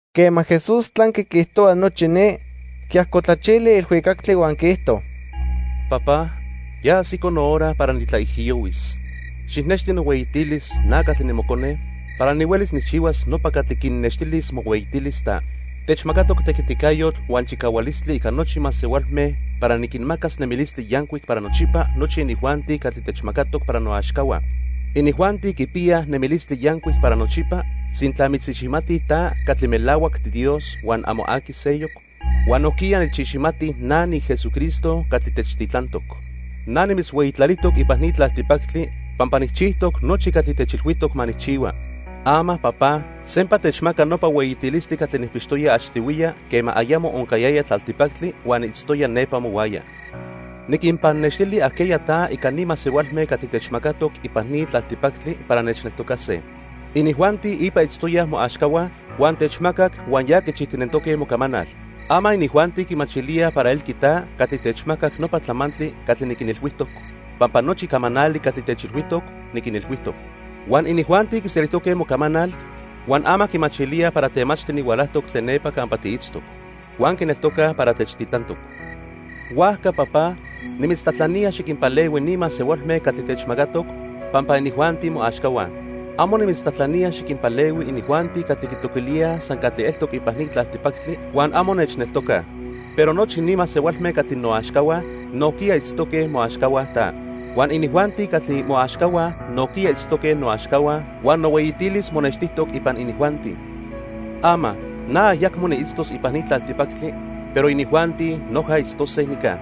Quema Jesús tlanqui quiijtohua nochi ni, quiajcotlachili ilhuicactli huan quiijto: "Papá, ya ajsico nohora para nitlaijiyohuis. Xijnexti nohueyitilis, na catli nimocone, para nihuelis nijchihuas nopa catli quinnextilis mohueyitilis ta. Techmacatoc tequiticayotl huan chicahualistli ica nochi masehualme para niquinmacas nemilistli yancuic para nochipa nochi inijuanti catli techmacatoc para noaxcahua. Inijuanti quipiyaj nemilistli yancuic para nochipa sintla mitziximatij ta catli melahuac tiDios huan amo aqui seyoc, huan nojquiya nechiximatij na niJesucristo catli techtitlantoc. "Na nimitzhueyitlalijtoc ipan ni tlaltipactli pampa nijchijtoc nochi catli techilhuijtoc ma nijchihua. Ama, Papá, sempa techmaca nopa hueyitilistli catli nijpixtoya achtihuiya quema ayamo oncayaya tlaltipactli huan niitztoya nepa mohuaya. "Niquinpannextili ajqueya ta ica ni masehualme catli techmacatoc ipan ni tlaltipactli para nechneltocase. Inijuanti ipa itztoyaj moaxcahua huan techmacac huan ya quichijtinentoque mocamanal. Ama inijuanti quimachilíaj para elqui ta catli techmacac nopa tlamantli catli niquinilhuijtoc, pampa nochi camanali catli techilhuijtoc, niquinilhuijtoc. Huan inijuanti quiselijtoque mocamanal, huan ama quimachilíaj para temachtli nihualajtoc tlen nepa campa tiitztoc. Huan quineltocaj para techtitlantoc. "Huajca, Papá, nimitztlajtlanía xiquinpalehui ni masehualme catli techmacatoc, pampa inijuanti moaxcahua. Amo nimitztlajtlanía xiquinpalehui inijuanti catli quitoquilíaj san catli eltoc ipan ni tlaltipactli huan amo nechneltocaj. Pero nochi ni masehualme catli noaxcahua nojquiya itztoque moaxcahua ta. Huan inijuanti catli moaxcahua nojquiya itztoque noaxcahua huan nohueyitilis monextijtoc ipan inijuanti. "Ama, na ayacmo niitztos ipan ni tlaltipactli, pero inijuanti noja itztose nica.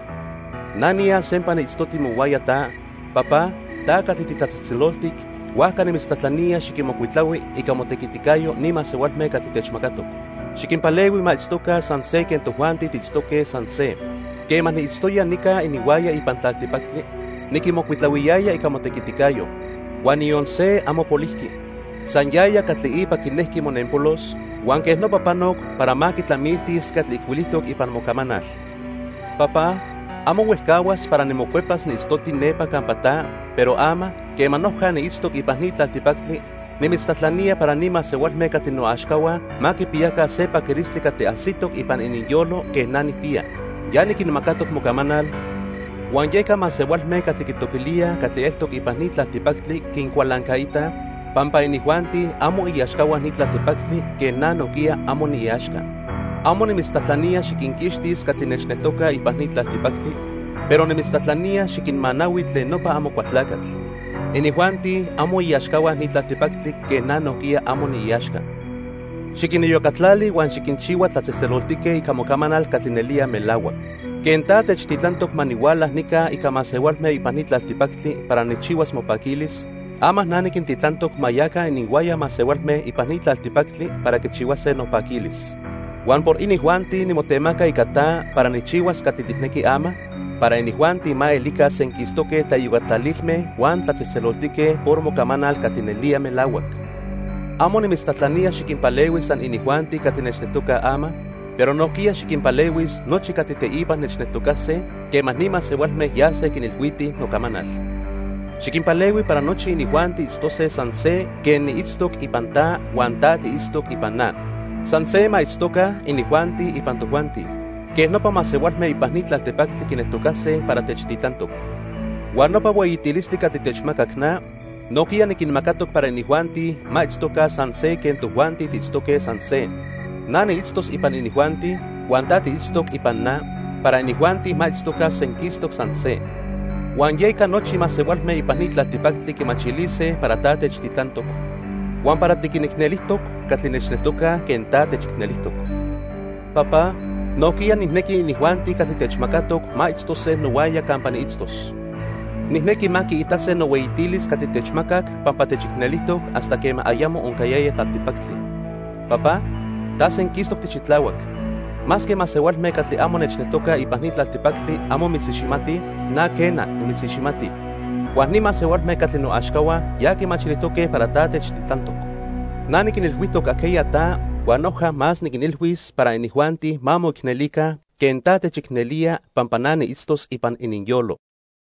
Na niyas sempa niitztoti mohuaya ta, Papá, ta catli titlatzejtzeloltic, huajca nimitztlajtlanía xiquinmocuitlahui ica motequiticayo ni masehualme catli techmacatoc. Xiquinpalehui ma itztoca san se quen tojuanti tiitztoque san se. Quema niitztoya nica ininhuaya ipan tlaltipactli, niquinmocuitlahuiyaya ica motequiticayo. Huan niyon se amo polijqui, san yaya catli ipa quinejqui monenpolos, huan quej nopa panoc para ma quitlamiltis catli ijcuilijtoc ipan mocamanal. "Papá, amo huejcahuas para nimocuepas niitztoti nepa campa ta, pero ama, quema noja niitztoc ipan ni tlaltipactli, nimitztlajtlanía para ni masehualme catli noaxcahua ma quipiyaca se paquilistli catli ajsitoc ipan ininyolo quen na nijpiya. Ya niquinmacatoc mocamanal huan yeca masehualme catli quitoquilíaj catli eltoc ipan ni tlaltipactli quincualancaitaj pampa inijuanti amo iaxcahua ni tlaltipactli quen na nojquiya amo niiaxca. Amo nimitztlajtlanía xiquinquixtis catli nechneltocaj ipan ni tlaltipactli, pero nimitztlajtlanía xiquinmanahui tlen nopa Amocualtlacatl. Inijuanti amo iaxcahua ni tlaltipactli quen na nojquiya amo niiaxca. Xiquiniyocatlali huan xiquinchihua tlatzejtzeloltique ica mocamanal catli nelía melahuac. Quen ta techtitlantoc ma nihuala nica ica masehualme ipan ni tlaltipactli para nijchihuas mopaquilis, ama na niquintitlantoc ma yaca ininhuaya masehualme ipan ni tlaltipactli para quichihuase nopaquilis. Huan por inijuanti nimotemaca ica ta para nijchihuas catli tijnequi ama, para inijuanti ma elica senquistoque tlaiyocatlalilme huan tlatzejtzeloltique por mocamanal catli nelía melahuac. "Amo nimitztlajtlanía xiquinpalehui san inijuanti catli nechneltocaj ama, pero nojquiya xiquinpalehuis nochi catli teipa nechneltocase quema ni masehualme yase quinilhuitij nocamanal. Xiquinpalehui para nochi inijuanti itztose san se quen niitztoc ipan ta huan ta tiitztoc ipan na. San se ma itztoca inijuanti ipan tojuanti. Quej nopa masehualme ipan ni tlaltipactli quineltocase para techtitlantoc. Huan nopa hueyitilistli catli techmacac na, nojquiya niquinmacatoc para inijuanti ma itztoca san se quen tojuanti tiitztoque san se. Na niitztos ipan inijuanti huan ta tiitztoc ipan na para inijuanti ma itztoca senquistoc san se. Huan yeca nochi masehualme ipan ni tlaltipactli quimachilise para ta techtitlantoc, huan para tiquinicnelijtoc catli nechneltocaj quen ta techicnelijtoc. "Papá, nojquiya nijnequi inijuanti catli techmacatoc ma itztose nohuaya campa niitztos. Nijnequi ma quiitase nohueyitilis catli techmacac pampa techicnelijtoc hasta quema ayamo oncayaya tlaltipactli. Papá, ta senquistoc tixitlahuac. Masque masehualme catli amo nechneltocaj ipan ni tlaltipactli amo mitziximatij, na quena, nimitziximati. Huan ni masehualme catli noaxcahua ya quimachilijtoque para ta techtitlantoc. Na niquinilhuijtoc ajqueya ta huan noja más niquinilhuis para inijuanti ma moicnelica quen ta techicnelía pampa na niitztos ipan ininyolo."